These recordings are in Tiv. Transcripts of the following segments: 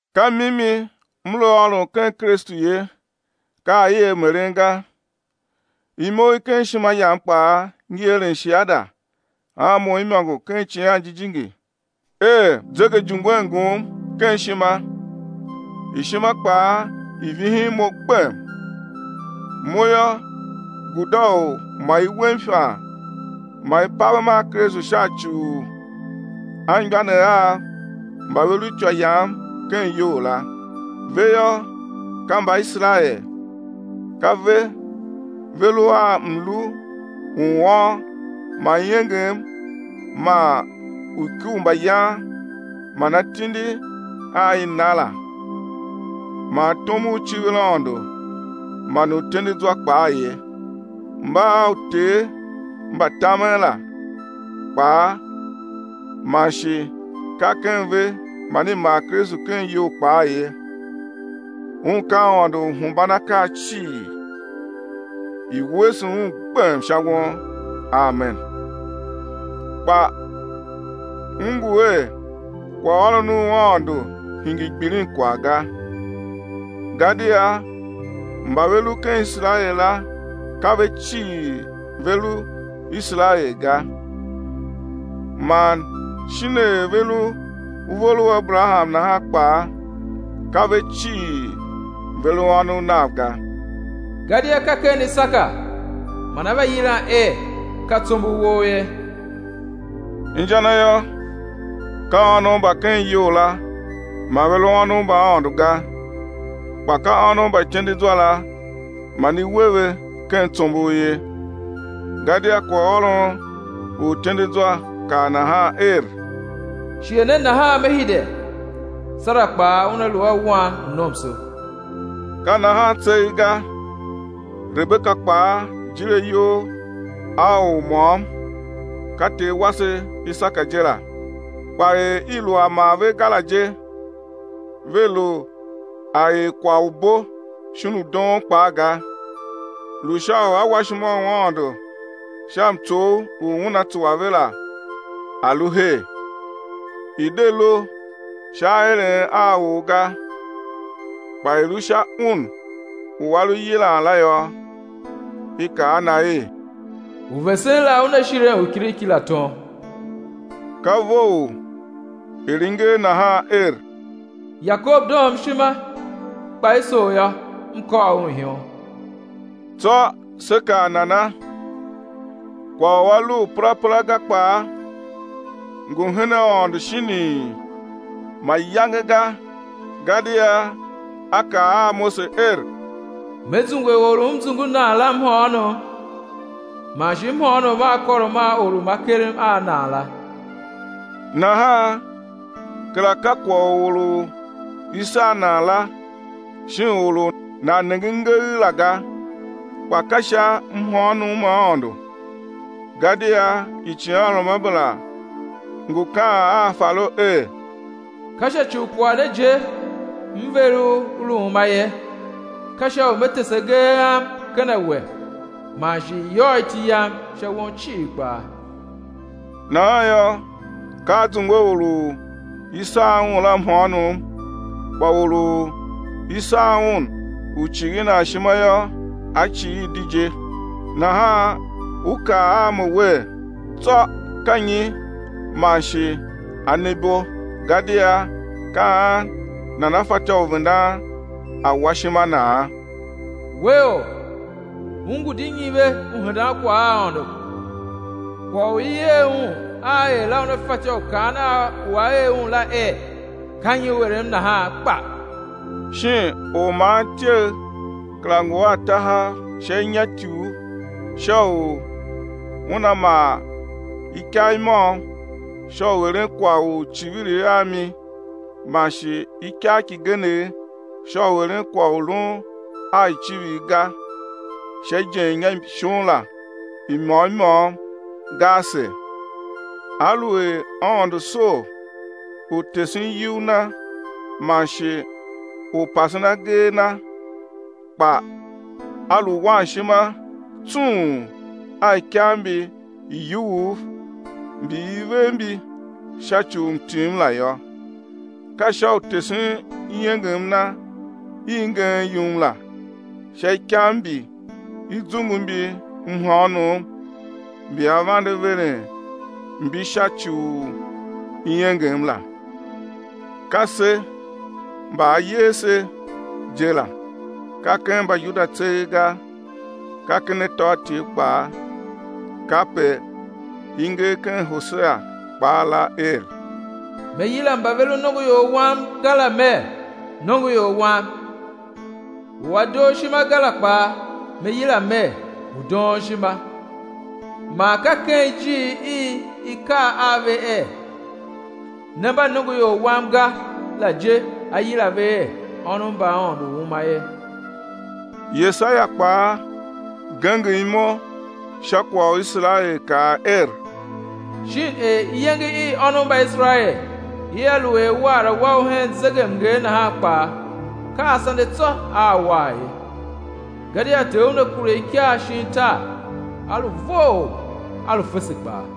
Ka mimi m lu ôron ken Kristu ye, ka aie m eren ga. Imo i ken ishima yam kpaa ngi eren shiada a mo imôngo ken Icighan Jijingi er zegeijungwen ngum ken ishima, ishima kpaa i vihin mo gbem. Mo yô guda u ma i wem ifan ma i pavem a Kristu sha ci u anmgbianev av mba ve lu ityô yam ken iyol la. Ve yô, ka Mbaiserael, ka ve ve lu a mlu u uôn man iengem man uikurmbayan man atindi a i na la, man tom u civir Aôndo man uityendezwa kpaa ye. Mba a uter mba tamen la kpaa man shi ka ken ve man i mar Kristu ken iyol kpaa ye. Un ka Aôndo u hemban akaa cii, i̱ wuese Un gbem sha won. Amen. Kpa unguer kwaghôron u Aôndo hingir gbilinkwagh ga, gadia mba ve lu ken Iserael la ka ve cii ve lu Iserael ga. Man shin er ve lu vor u Aberaham nahan kpaa, ka ve cii ve lu ônov nav ga, gadia ka ken Isaka man á va yilan er ka tsombor wou ye. Inja na yô, ka ônov mba ken iyol la man ve lu ônov mba Aôndo ga, kpa ka ônov mba ityendezwa la man i we ve ken tsombor ye. Gadia kwaghôron u ityendezwa kaa nahan er: Shighe ne nahan Me hide, Sara kpaa una lu a wan u nomso. Ka nahan tseegh ga, Rebeka kpaa jile iyol a or môm, ka ter wase Isaka je la. Kpa er i lu a mar ve ga la je, ve lu a er kwagh u bo shin u doon kpaa ga, lu sha u awashima u Aôndo sha mtsough u Una tsuwa ve la a lu her, i̱ de lu sha aeren a or ga, kpa i̱ lu sha Un u A lu yilan la yô, i kaa a na er, u vesen la una shiren u kiriki la tom. Ka vough er i nger nahan er: Yakob doom ishima kpa Isou yô, M kôr un ihom. Tsô sé kaa nana? Kwagh u a lu u perapera ga kpaa ngu hen Aôndo shinii? Mayange ga. Gadia A kaa a Mose er, Me zungwe or u M zungu nan la mhôônom man shi mhôônom maa kôrom a or u ma kerem a nan la. Nahan kera ka kwagh u or u i sar nan la shin or u nan nenge ngegh la ga, kpa ka sha mhôônom ma Aôndo. Gadia icighanruamabera ngu kaan a Farao er, ka sha ci u kwagh ne je M ver u u lu uma ye, ka sha u Me tese agee a Am ken a we man shi i̱ yôô iti Yam sha won cii kpaa. Nahan yô ka A zungwe or u i sar Un la mhôônom, kpa or u i sar Un u cighir nan ishima yô, A cighir di je. Nahan ú kaa a mo wer: Tsô ka nyi man shi A ne ibo? Gadia ka an nana fatyô u vendan awashima Naa? We or, u ngu di nyi ve u hendan kwagh a Aôndo, kwagh u i er un a er la una fatyô u kaan a u a er un la er: Ka nyi u erem nahan, kpa? Shin ormaantyegh kera ngu a tahav sha inyatyuu sha u una maa ikagh i môm sha u eren kwagh u icivirigh a mi man shi ikagh kigenegh sha u eren kwagh u lun a icivir ga, sha ijennya shon la i môm i môm ga ase? Aluer Aôndo soo u tesen iyugh Na man shi u pasen agee a Na, kpa A lu wan ishima tsung a ikav mbi iyughuv mbi i ver mbi sha ci u mtim la yô, ka sha u tesen iengem Na i ngeen yum la sha ikav mbi i zungu mbi mhôônom mbi A vande veren mbi sha ci u iengem la. Ka se mba A yer se je la, ka ken Mbayuda tseegh ga, ka ken atôatyev kpaa. Kape i nger ken Hosea kpaa la er: Me yila mba ve lu nongoior Wam ga la Mer: nongoior Wam, u a doo ishima ga la kpaa Me yila Mer: U doon ishima. Man ka ken ijiir i i kaa a ve er: Ne mba nongoior Wam ga, la je á yila ve er: Ônov mba Aôndo u uma, ye. Yesaia kpaa genger imo sha kwagh u Iserael kaa er: Shin er iyenge i ônov mba Iserael ia lu er waarawa u hen zegemnger nahan kpaa, ka asande tsô aa war ye. Gadia Ter Una kure ikaa shin tar, á lu vough á lu fese kpaa.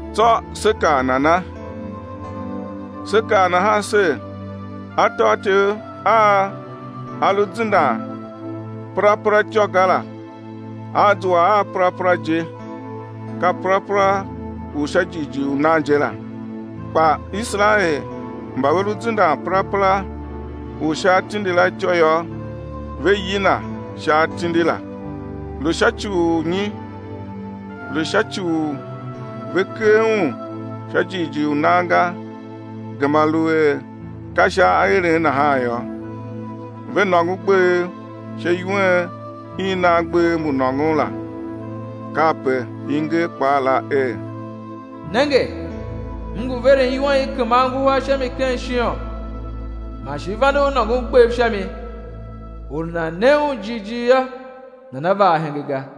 Tsô se kaa nana? Se kaa nahan ser, atôatyev a a lu zendan perapera ityô ga la a zua a perapera je, ka perapera u sha jighjigh u nan je la. Kpa Iserael mba ve lu zendan perapera u sha atindi la ityô yô, ve yina sha atindi la. Lu sha ci u nyi? Lu sha ci u ve ker un sha jighjigh u nan ga gema lu er ka sha aeren nahan yô. Ve nôngo gbev sha iwen i nan gbev mbu nôngon la. Kape i nger kpaa la er: Nenge, M ngu veren iwen i keman nguhar sha mi ken Shion, man shi vande u nôngon gbev sha mi. Or u nan ne Un jighjigh yô, nana va ahenge ga.